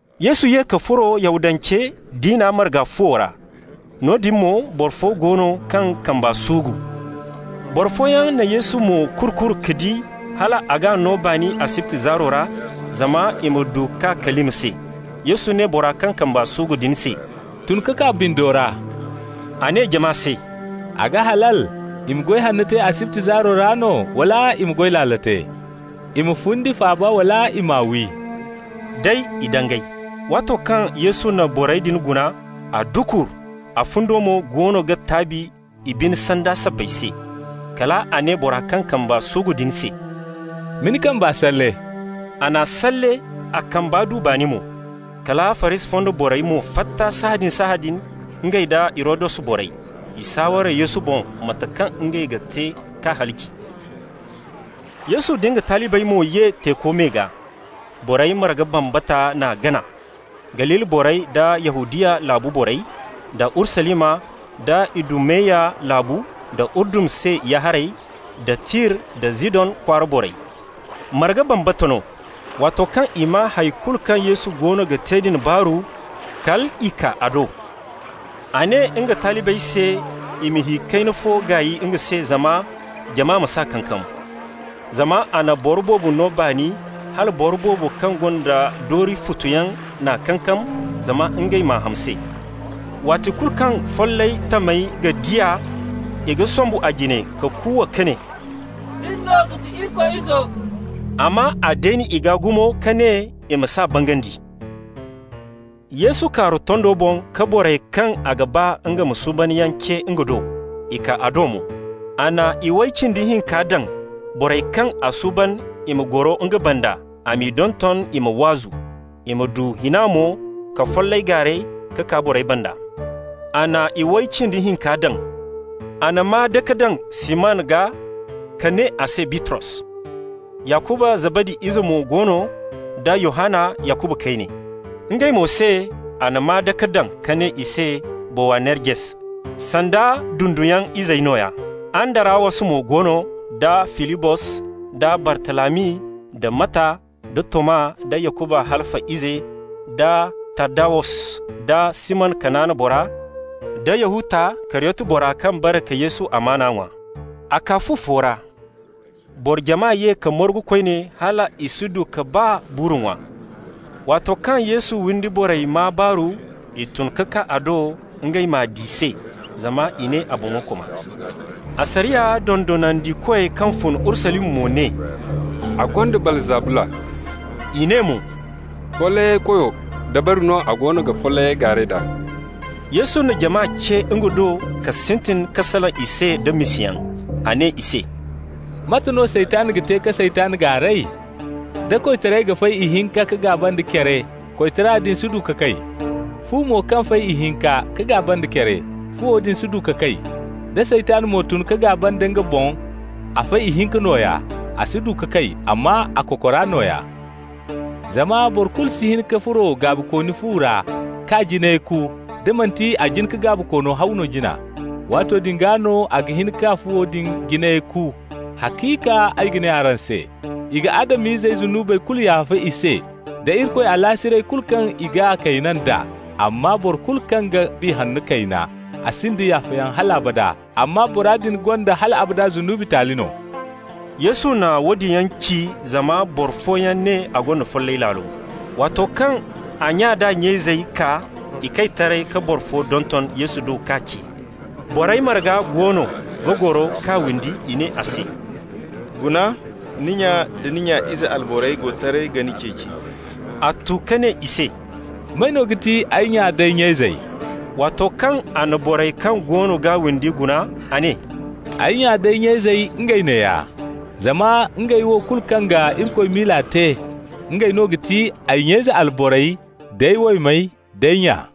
Yesu ye ka furo Yahudance diina marga fuwo ra. Noodin mo boro fo go no kaŋ kamba suugu. Boro fooyaŋ na Yesu mo-kuru-kuru ka di hal a g'a no baani asibti zaaro ra, zama i ma du k'a kalima se. Yesu ne bora kaŋ kamba suugu din se: «Tun ka kaa bindo ra.» A ne jama se: «A ga halal i ma goy hanno te asibti zaaro ra no, wala i ma goy laalo te? I ma fundi faaba wala i m'a wi?» Day i dangay. Waato kaŋ Yesu na borey din guna, a dukur, a fundo mo goono ga taabi i bine sanda sabbay se. Kal a ne bora kaŋ kamba suugu din se: «Ma ni kamba salle.» A n'a salle, a kamba du baani mo. Kala Farisi fonda borey mo fatta sahãadin-sahãadin, ngey nda Hirodus borey. I saaware Yesu boŋ mate kaŋ ngey ga te k'a halaci. Yesu nda nga talibey mo ye teeko me gaa. Borey marga bambata n'a gana, Galili borey da Yahudiya laabu borey, da Urusalima, da Idumeya laabu, da Urdun se ya-haray, da Tir da Zidon kwaara borey -- marga bambata no. Waato kaŋ i maa hay kulu kaŋ Yesu goono ga te din baaru, kal i kaa a do. A ne nga talibey se i ma hi kayna fo gaay nga se, zama jama ma s'a kankam. Zama a na boro boobo no baani hala boro boobo kaŋ gonda doori futu yaŋ n'a kankam zama ngey m'a ham se. Waati kulu kaŋ follay tamey ga di a, i ga sombu a jine ka kuuwa ka ne: «Nin no ga ti Irikoy Izo!» Amma a deeni i gaa gumo ka ne i ma s'a bangandi. Yesu kaaru tondo boŋ ka borey kaŋ a ga ba nga ma suuban yaŋ ce nga do. I kaa a do mo. A na iway cindi hinka daŋ, borey kaŋ a suuban i ma goro nga banda, a m'i donton i ma waazu, i ma du hina mo ka follay gaaray ka kaa borey banda. A na iway cindi hinka daŋ. A na maa-dake daŋ Siman gaa ka ne a se Bitros. Yakuba Zabadi ize mo go no, da Yohanna Yakuba kayne. Ngey mo se a na maa-dake daŋ ka ne i se Bowanerges, sanda dunduyaŋ izey nooya. Andarawos mo go no, da Filibos, da Bartalami, da Matta, da Toma, da Yakuba Halfa ize, da Taddawus, da Siman Kanaana bora, da Yahuta, Kariyoti bora kaŋ bare ka Yesu amaana ŋwa. A kaa fu fo ra. Boro jama ye ka margu koyne hal i si du ka baa buuru ŋwa. Waato kaŋ Yesu windi borey maa baaru, i tun ka kaa a do ngey m'a di se, zama i ne a boŋo koma. Asariya dondonandikoy kaŋ fun Urusalima mo ne: «A gonda Baalzabula.» I ne mo: «Follayey koyo dabari no a go ga follayyaŋ gaaray d'a.» Yesu na jama ce nga do ka sintin ka salaŋ i se da misayaŋ. A ne i se: «Mate no Saytan ga te ka Saytan gaaray? Da koytaray ga fay ihinka ka gaaba nda care, koytara din si du ka kay. Fu mo kaŋ fay ihinka ka gaaba nda care, fuwo din si du ka kay. Da Saytan mo tun ka gaaba nda nga boŋ, a fay ihinka nooya. A si du ka kay, amma a kokora nooya. Zama boro kulu si hin ka furo gaabikooni fu ra k'a jinay ku, da manti a jin ka gaabikoono haw no jina. Waato din gaa no a ga hin ka fuwo din jinayey ku. Haciika ay ga ne araŋ se: i ga Adam-izey zunubey kulu yaafa i se, da Irikoy alaasiray kulu kaŋ i g'a kayna d'a. Amma boro kulu kaŋ ga Biya Hanno kayna, a sinda yaafayaŋ hal abada amma bora din gonda hal abada zunubi taali no.» Yesu na woodin yaŋ ci zama boro fooyaŋ ne a gonda follay laalo. Waato kaŋ a nya d'a nya izey kaa, i kay taray ka boro fo donton Yesu do k'a ce. Borey marga goono ga goro k'a windi. I ne a se: «Guna, ni nya da ni nya ize alborey go taray ga ni ceeci.» A tu ka ne i se: «May no ga ti ay nya nd'ay nya izey?» Waato kaŋ a na borey kaŋ goono g'a windi guna, a ne: «Ay nya nd'ay nya izey, ngey neeya! Zama ngey wo kulu kaŋ ga Irikoy miila te, ngey no ga ti ay nya ize alborey, d'ay waymey, d'ay nya.»